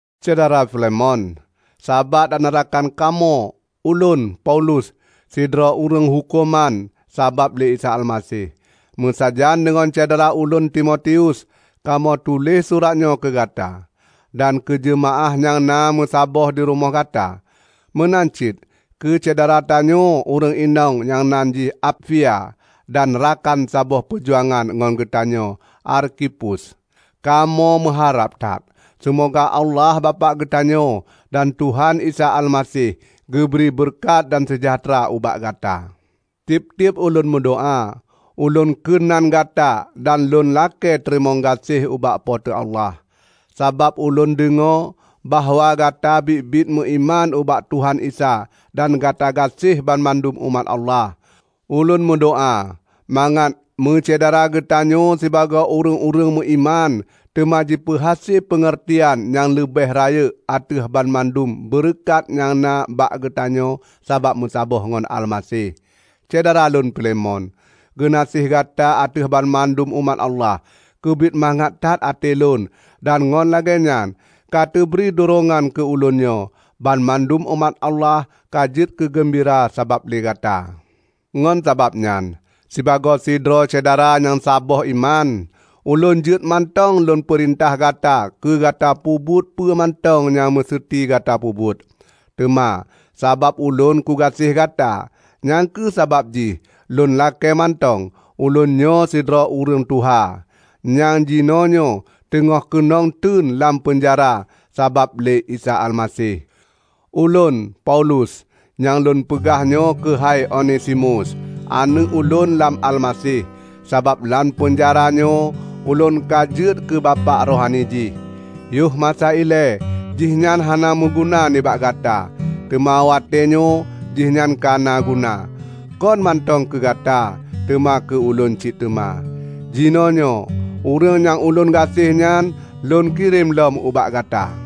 Syedara Filemon, sabat dan rakan kamoe! Ulôn, Paulus, sidroe ureuëng huköman sabab lé Isa Almaseh, meusajan deungon syedara ulôn Timotius, kamoe tuléh surat nyoe keu gata dan keu jeumaáh nyang na meusapat dirumoh gata; meunan cit keu syedara tanyoe ureuëng inong nyang nan jih Apfia dan rakan saboh peujuangan ngon geutanyoe Arkhipus. Kamoe meuharab that seumoga Allah Bapak geutanyoe dan Tuhan Isa Almaseh geubri beureukat dan seujahteura ubak gata. Tieb-tieb ulôn meudoá, ulôn kheun nan Gata dan lôn lakée teurimong gaséh ubak Po teu Allah. Sabab ulôn deungoe bahwa Gata biet-biet meuiman ubak Tuhan Isa dan gata gaséh banmandum umat Allah. Ulôn meudoá mangat meusyedara geutanyoe sibagoe ureuëng-ureuëng meuiman teuma jipeuhase peungeurtian nyang leubeh rayeuk ateueh banmandum beureukat nyang na bak geutanyoe sabab meusaboh ngon Almaseh. Syedara lôn Filemon, geunaséh gata ateueh banmandum umat Allah, keubiet mangat that até lôn dan ngon lagée nyan ka teubri durongan keu ulôn nyoe! Banmandum umat Allah ka jeuet keu geumbira sabab lé Gata. Ngon sabab nyan, sibagoe sidroe syedara nyang saboh iman, ulôn jeuet mantong lôn peurintah Gata keu Gata peubuet peue mantong nyang meuseuti Gata peubuet. Teuma sabab ulôn kugaséh Gata, nyang kheueh sabab jih lôn lakée mantong. Ulôn nyoe sidroe ureuëng tuha nyang jinoenyoe teungoh keunong teun lam peunjara sabab lé Isa Almaseh. Ulôn, Paulus, nyang lôn peugah nyoe keuhai Onesimus, aneuëk ulôn lam Almaseh. Sabab lam peunjara nyoe ulôn ka jeuet keu bapak rohani jih. Yoh masa ilée jih nyan hana meuguna nibak gata, teuma watée nyoe jihnyan ka na guna, kon mantong keu gata, teuma keu ulôn cit teuma. Jinoenyoe ureuëng nyang ulôn gaséh nyan lôn kirém lom ubak gata.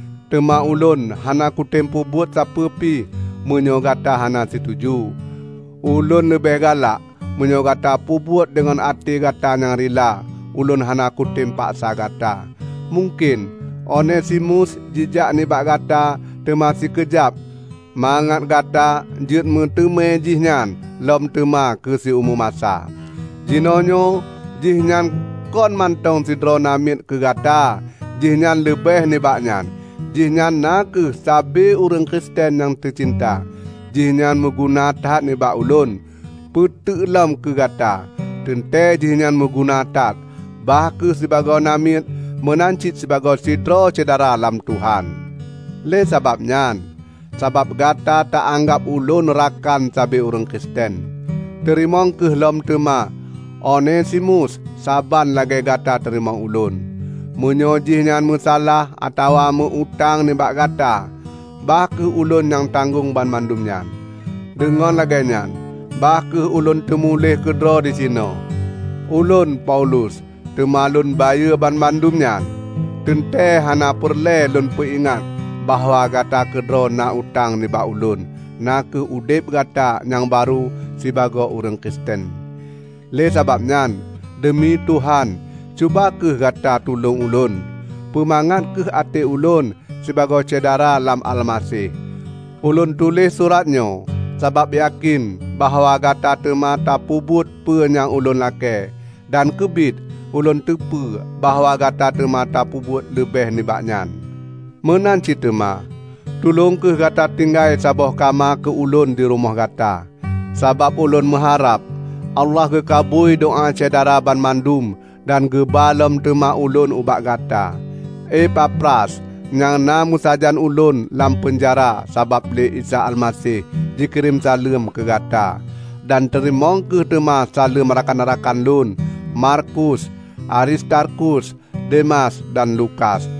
Teuma ulôn hana kutem peubuet sapeue pi meunyoe Gata hana situju. Ulôn leubeh galak meunyoe Gata peubuet deungon até gata nyang rila; ulôn hana kutem paksa gata. Mungken Onesimus jijak nibak Gata teuma sikeujab mangat Gata jeuet meuteumé jih nyan lom teuma keu siumu masa. Jinoenyoe jihnyan kon mantong sidroe namiet keu Gata; jihnyan leubeh nibak nyan. Jihnyan na kheueh sabe ureuëng Kristen nyang teucinta. Jihnyan meuguna that nibak ulôn, peuteuk lom keu gata! Teuntée jihnyan meuguna that bah kheueh sibagoe namiet meunan cit sibagoe sidroe syedara lam Tuhan! Lé sabab nyan, sabab Gata ta anggab ulôn rakan sabe ureuëng Kristen, teurimong kheueh lom teuma Onesimus saban lagée Gata tateurimong ulôn. Meunyoe jihnyan meusalah atawa meu utang nibak gata, bah kheueh ulôn nyang tanggong banmandum nyan. Deungon lagée nyan, bah kheueh ulôn teumuléh keudroe disinoe: Ulôn, Paulus, teuma lôn bayeue banmandum nyan. (Teuntée hana peureulée lôn peuingat bahwa Gata keudroe na utang nibak ulôn, na kheueh udeb gata nyang barô sibagoe ureuëng Kristen.) Lé sabab nyan, deumi Tuhan cuba kheueh gata tulông ulôn, peumangat kheueh até ulôn sibagoe syedara lam Almaseh. Ulôn tuléh suratnyoe sabab yakén bahwa Gata teuma tapeubuet peue nyang ulôn lakée. Dan keubiet ulôn teupeue bahwa Gata teuma tapeubuet leubeh nibak nyan. Meunan cit teuma, tulông kheueh gata tinggai saboh kama keu ulôn di rumoh gata, sabab ulôn meuharab Allah geukabui doá Syedara banmandum dan geuba lom teuma ulôn ubak gata. Epafras, nyang na meusajan ulôn lam peunjara sabab lé Isa Almaseh, jikirém saleuem keu gata. Dan teurimong kheueh teuma saleuem rakan-rakan lôn: Markus, Aristarkus, Demas dan Lukas.